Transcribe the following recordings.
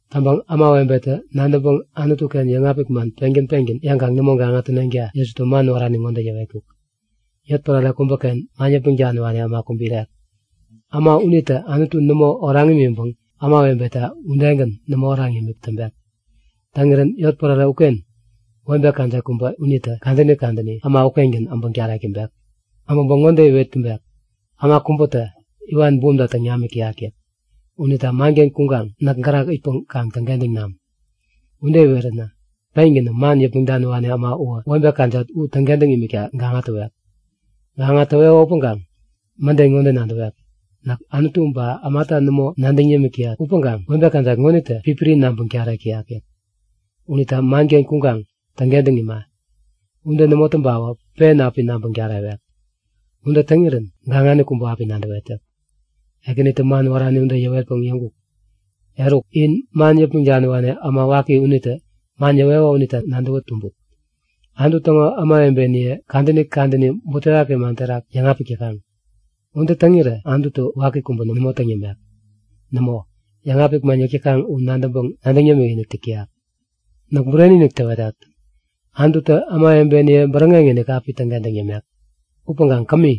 Täŋpäŋ ämawebetä nadäŋpäŋ Anutu-ken yäŋapik man pengän pengän yäŋkaŋ nämo gaŋa täneŋta Jesutä man wärani ŋode yäwetkuk; Yotpärare kubäken man yäpmäŋ daniwani äma kubä irek. Äma unitä Anutu nämo oraŋ imiŋpäŋ ämawebeta udegän nämo oraŋ yämik täŋpek. Täŋirän yotpärare ukengän webe kajat kubä unitä kadäni kadäni äma ukengän äbäŋ tarek täŋpek. Äbäŋpäŋ ŋode iwet täŋpek; Äma kubätä iwan bumta täŋ namik täyak yäk. Unita manken kuŋkaŋ näk gärak itpäŋ kaŋ täŋkentäŋ nam. Ude iweränä pengänä man yäpmäŋ daniwani äma uwä webe kajat u täŋkentäŋ imikta gaŋa täwek. Gaŋa täweko upäŋkaŋ mäden ŋode nadäwek; Näk Anutu ba ämata nämo nadäŋ yämik täyat upäŋkaŋ webe kajat ŋonitä pipiri nabäŋ tarek täyak yäk. Unita manken kuŋkaŋ täŋkentäŋ ima. Ude nämo täŋpawä pen api nabäŋ tarewek. Ude täŋirän gaŋani kubä api nadäwet yäk. Ekänitä man wärani ude yäwetpäŋ yäŋkuk; Eruk, in man yäpmäŋ daniwani äma waki unitä man yäweko unita nadäwä tumbut. Anutu täŋo ämawebeniye kadäni kadäni butewaki man terak yäŋapik täkaŋ. Ude täŋirä Anututä waki kubä nämo täŋ yämek. Nämo, yäŋapik man yäk täkaŋ u nadäŋpäŋ nadäŋ yämikinik täk täyak. Näk bureni-inik täwetat! Anututä ämawebeniye bäräŋeŋ-inik api täŋkentäŋ yämek. Upäŋkaŋ kämi,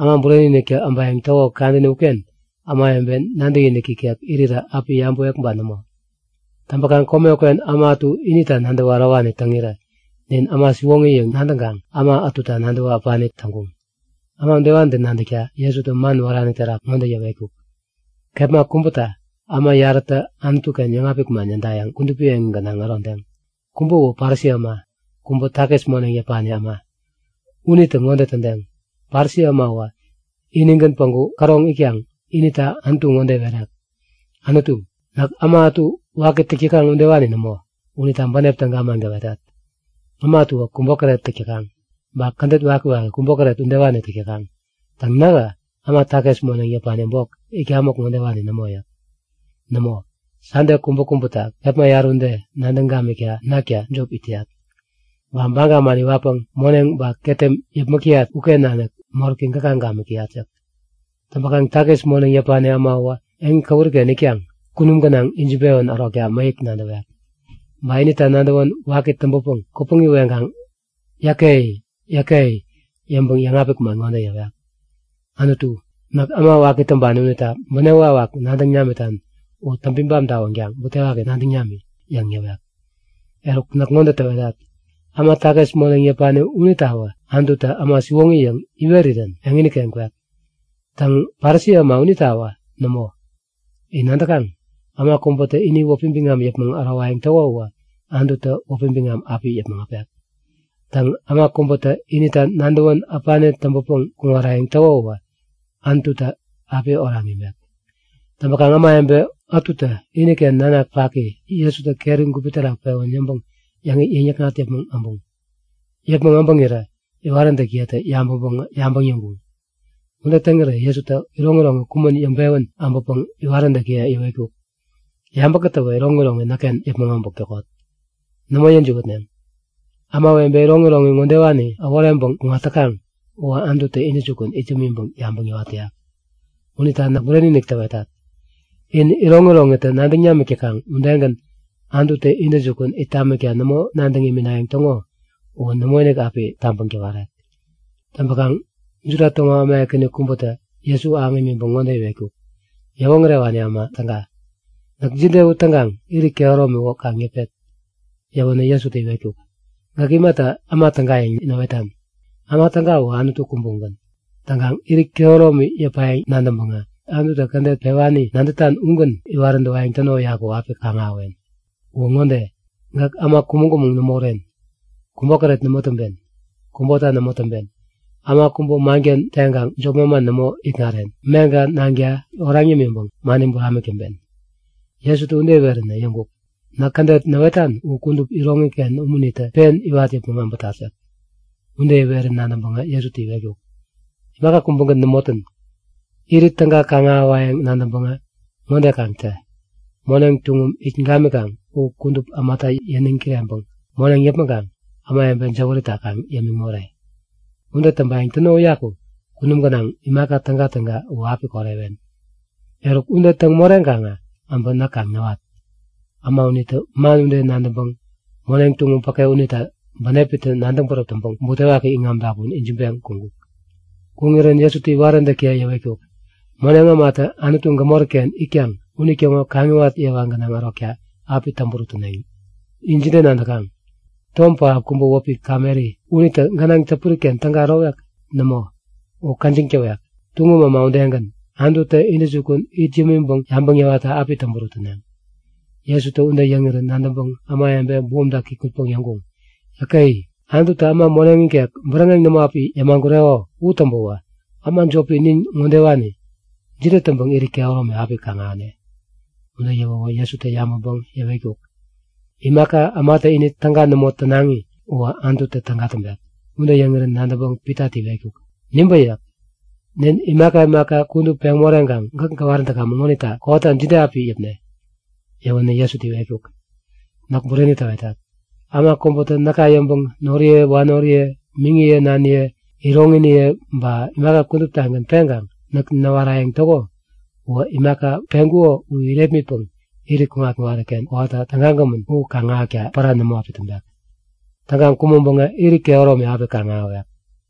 Äma Bureni-iniktä äbayäŋ täko kadäni uken ämawebe nadäkinik ikek irirä api yabäwek ba nämo? Täŋpäkaŋ kome uken äma ätu inita nadäwä ärowani täŋirä nin äma siwoŋi yäŋ nadäŋkaŋ äma ätuta nadäwä äpani täŋkuŋ. Äma udewanitä nadäkta Jesutä man wärani terak ŋode yäwetkuk; Kepma kubäta äma yarätä Anutu-ken yäŋapik man yädayäŋ kudupi eŋi gänaŋ ärodeŋ. Kubä u Parisi äma, kubä takis moneŋ yäpani äma. Unitä ŋode tädeŋ; Parisi äma uwä inigän päŋku käroŋ itkaŋ inita Anutu ŋode iwerek; Anutu, näk äma ätu waki täk täkaŋ udewani nämo unita bänep täga man gäwetat. Äma ätuwä kubota täk täkaŋ. Ba kädet wakiwaki, kubokäret udewani täk täkaŋ. Täŋ nähä äma takis moneŋ yäpani bok itkamäk ŋodewani nämo yäk. Nämo, Sande kubäkubäta kepma yarä ude nadäŋ gamikta nakta jop it täyat. Ba baga man iwatpäŋ moneŋ ba ketem yäpmäk täyat uken nanik moräki gäka gamik täyat yäk. Täŋpäkaŋ takis moneŋ yäpani äma uwä eŋi käwuriken itkaŋ kunum gänaŋ ijiŋpewän ärokta mäyäk nadäwek. Ba inita nadäwän waki täŋpäpäŋ kupäŋi weŋkaŋ Yäke! Yäke! yäŋpäŋ yäŋapik man ŋode yäwek; Anutu, näk äma waki täŋpani unita bänep wakwak nadäŋ namitan u täŋpi bam tawänkaŋ butewaki nadäŋ nami! yäŋ yäwek. Eruk, näk ŋode täwetat; Äma takis moneŋ yäpani unitawä Anututä äma siwoŋi yäŋ iwerirän eŋini-ken kwek. Täŋ, Parisi äma unitawä nämo. In nadäkaŋ? Äma kubätä ini wäpi biŋam yäpmäŋ ärowayäŋ täko uwä Anututä wäpi biŋam api yäpmäŋ äpek. Täŋ, äma kubätä inita nadäwän äpani täŋpänpäŋ kuŋarayäŋ täko uwä Anututä api oraŋ imek. Täŋpäkaŋ ämawebe ätutä iniken nanak paki Jesutä keri gupi terak pewän yäŋpäŋ yäŋ-yäkŋat yäpmäŋ äbuŋ. Yäpmäŋ äbäŋirä iwaräntäkiyetä yabäŋpäŋ yabäŋ yäŋkuŋ. Ude täŋirä Jesutä iroŋiroŋi kumän yäŋpewän äbäpäŋ iwaräntäkiye yäwetkuk; Yabä kätäwä iroŋiroŋi näkken yäpmäŋ äbäk täkot. Nämo yäjiwätneŋ. Ämawebe iroŋiroŋi ŋodewani äworeŋpäŋ kuŋat täkaŋ uwä Anututä intäjukun it yämiŋpäŋ yabäŋ yäwat täyak. Unita näk bureni-inik täwetat; In iroŋi iroŋitä nadäŋ namik täkaŋ udegän Anututä intäjukun it tamikta nämo nadäŋ iminayäŋ täŋo uwä nämoinik api tabäŋ täwerek. Täŋpäŋ Juda täŋo äma ekäni kubätä Jesu ahäŋ imiŋpäŋ ŋode iwetkuk; Yäwoŋärewani äma täga, Näk jide u täŋkaŋ irit kehäromi u kaŋ yäpet? Yäwänä Jesutä iwetkuk; Gäk imata äma täga yäŋ näwetan? Äma täga uwä Anutu kubä ugän. Täŋkaŋ, irit kehäromi yäpayäŋ nadäŋpäŋä Anututä kädet pewani nadätan ugän iwarayäŋ täno uyaku api kaŋ-ahäwen. Uwä ŋode; Gäk äma kumäŋ-kumäŋ nämo uren, kubokäret nämo täŋpen, kubota nämo täŋpen, äma kubä manken teŋkaŋ jop manman nämo ikŋaren, gäk meŋka nanka oraŋ yämiŋpäŋ mani buramik täŋpen. Jesutä ude iweränä yäŋkuk; Näk kädet näwetan u kudup iroŋiken umunitä pen iwat yäpmäŋ äbätat yäk. Ude iwerän nadäŋpäŋ Jesutä iwetkuk; Imaka kubägän nämo tän. Irit täga kaŋ-ahäwayäŋ nadäŋpäŋä ŋode kaŋ tä; Moneŋ tuŋum it gamikaŋ u kudup ämata yäniŋ kireŋpäŋ moneŋ yäpmäŋkaŋ ämawebe jäwärita kaŋ yämiŋ more. Ude täŋpayäŋ täno uyaku kunum gänaŋ imaka tägatäga u api korewen. Eruk, ude täŋ moreŋkaŋä äbä näk kaŋ näwat! Äma unitä man ude nadäŋpäŋ moneŋ tuŋum päke unita bänepitä nadäŋ bäräp täŋpäŋ butewaki iŋam dapun ijiŋpeŋ kuŋkuk. Kuŋirän Jesutä iwaräntäkiye yäwetkuk; Moneŋ ämatä Anutu gämori-ken itkaŋ unitäŋo kaŋiwat yewa gänaŋ ärokta api täŋburut täneŋ. In jide nadäkaŋ? Tom pähap kubä wäpi kameri unitä gänaŋ täpuri-ken täga ärowek? Nämo, u käjiŋ täwek. Tuŋum äma udegän, Anututä intäjukun it yämiŋpäŋ yabäŋ yäwatta api täŋburut täneŋ. Jesutä ude yäŋirän nadäŋpäŋ ämawebe bumta kikŋutpäŋ yäŋkuŋ; Yäke! Anututä äma moneŋ ikek bäräŋeŋ nämo api yämagureko u täŋpäwä äma jopi nin ŋodewani jide täŋpäŋ irit kehäromi api kaŋ-ahäne? Ude yäwäwä Jesutä yabäŋpäŋ yäwetkuk; Imaka ämatä ini täga nämo tänaŋi uwä Anututä täga täŋpek. Ude yäŋirän nadäŋpäŋ Pitatä iwetkuk; Nibä yäk. Nin imaka imaka kudup peŋ moreŋkaŋ gäk gäwarän täkamäŋ ŋonita kowata jide api yäpne? Yäwänä Jesutä iwetkuk; Näk bureni täwetat; Äma kubätä näka yäŋpäŋ noriye wanoriye, miŋiye naniye, iroŋiniye ba imaka kuduptagän peŋkaŋ näk näwarayäŋ täko uwä imaka peŋkuko u irepmitpäŋ irit kuŋat-kuŋariken kowata tägagämän u kaŋ ahäkta pära nämo api täŋpek. Täŋkaŋ kumäŋpäŋä irit kehäromi api kaŋ-ahäwek.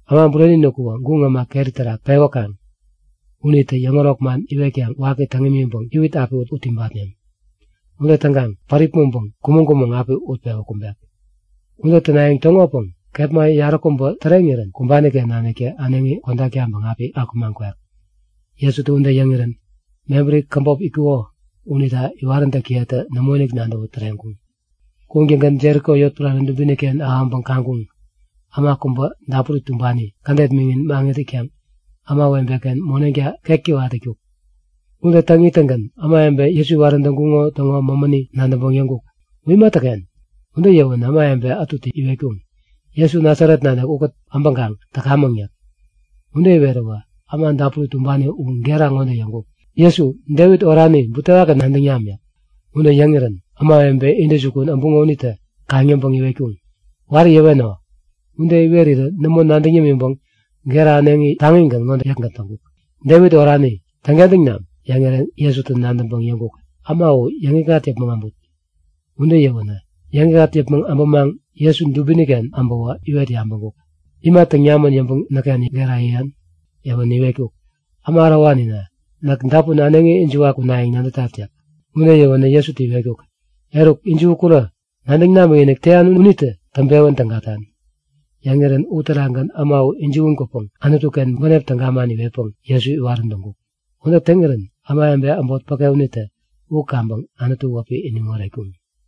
Äma Bureni-inik uwä guŋ äma keri terak pewäkaŋ unitä yäŋärok man iwetkaŋ waki täŋ imiŋpäŋ, iwit api ut ibatneŋ. Ude täŋkaŋ päripmäŋpäŋ kumäŋ-kumäŋ api utpewä kumbek. Ude tänayäŋ täŋopäŋ kepma yaräkubä täreŋirän kumbani-ken naniktä äneŋi kodak taŋpäŋ api akumaŋ kwek. Jesutä ude yäŋirän mebäri käbop itkuko unita iwaräntäkiyetä nämoinik nadäwä täreŋkuŋ. Kuŋtäŋgän Jeriko yotpärare dubini-ken ahäŋpäŋ kaŋkuŋ. Äma kubä dapuri tumbani, kädet miŋin maŋit itkaŋ ämawebe-ken moneŋta ketkewat itkuk. Ude täŋ ittäŋgän ämawebe Jesu iwarän täŋkuŋo täŋo mämäni nadäŋpäŋ yäŋkuk; U imatäken? Ude yäwänä ämawebe ätutä iwetkuŋ; Jesu Nasaret nanik ukät äbäŋkaŋ täkamäŋ yäk. Ude iweräwä äma dapuri tumbani u gera ŋode yäŋkuk; Jesu, Devit orani, butewaki nadäŋ nami! yäk. Ude yäŋirän ämawebe intäjukun äbuŋo unitä kaŋ-yäŋpäŋ iwetkuŋ; Wari yäweno! Ude iwerirä nämo nadäŋ yämiŋpäŋ gera äneŋi taŋigän ŋode yäkgän täŋkuk; Devit orani, täŋkentäŋ nami! Yäŋirän Jesutä nadäŋpäŋ yäŋkuk; Äma u yäŋikŋat yäpmäŋ äbut. Ude yäwänä yäŋikŋat yäpmäŋ äbämaŋ Jesu dubini-ken äbäwä iwet yabäŋkuk; Ima täŋ namän yäŋpäŋ näkken gera yäyan? Yäwänä iwetkuk; Äma ärowanina, näk dapun äneŋi ijiwa kunayäŋ nadätat yäk. Ude yäwänä Jesutä iwetkuk; Eruk, ijiwi kurä! Nadäŋ namikinik täyan unitä täŋpewän tägatan. Yäŋirän uterakgän äma u ijiwän kwäpäŋ Anutu-ken bänep täga man iwetpäŋ Jesu iwarän täŋkuk. Ude täŋirän ämawebe äbot päke unitä u kaŋpäŋ Anutu wäpi iniŋ oretkuŋ.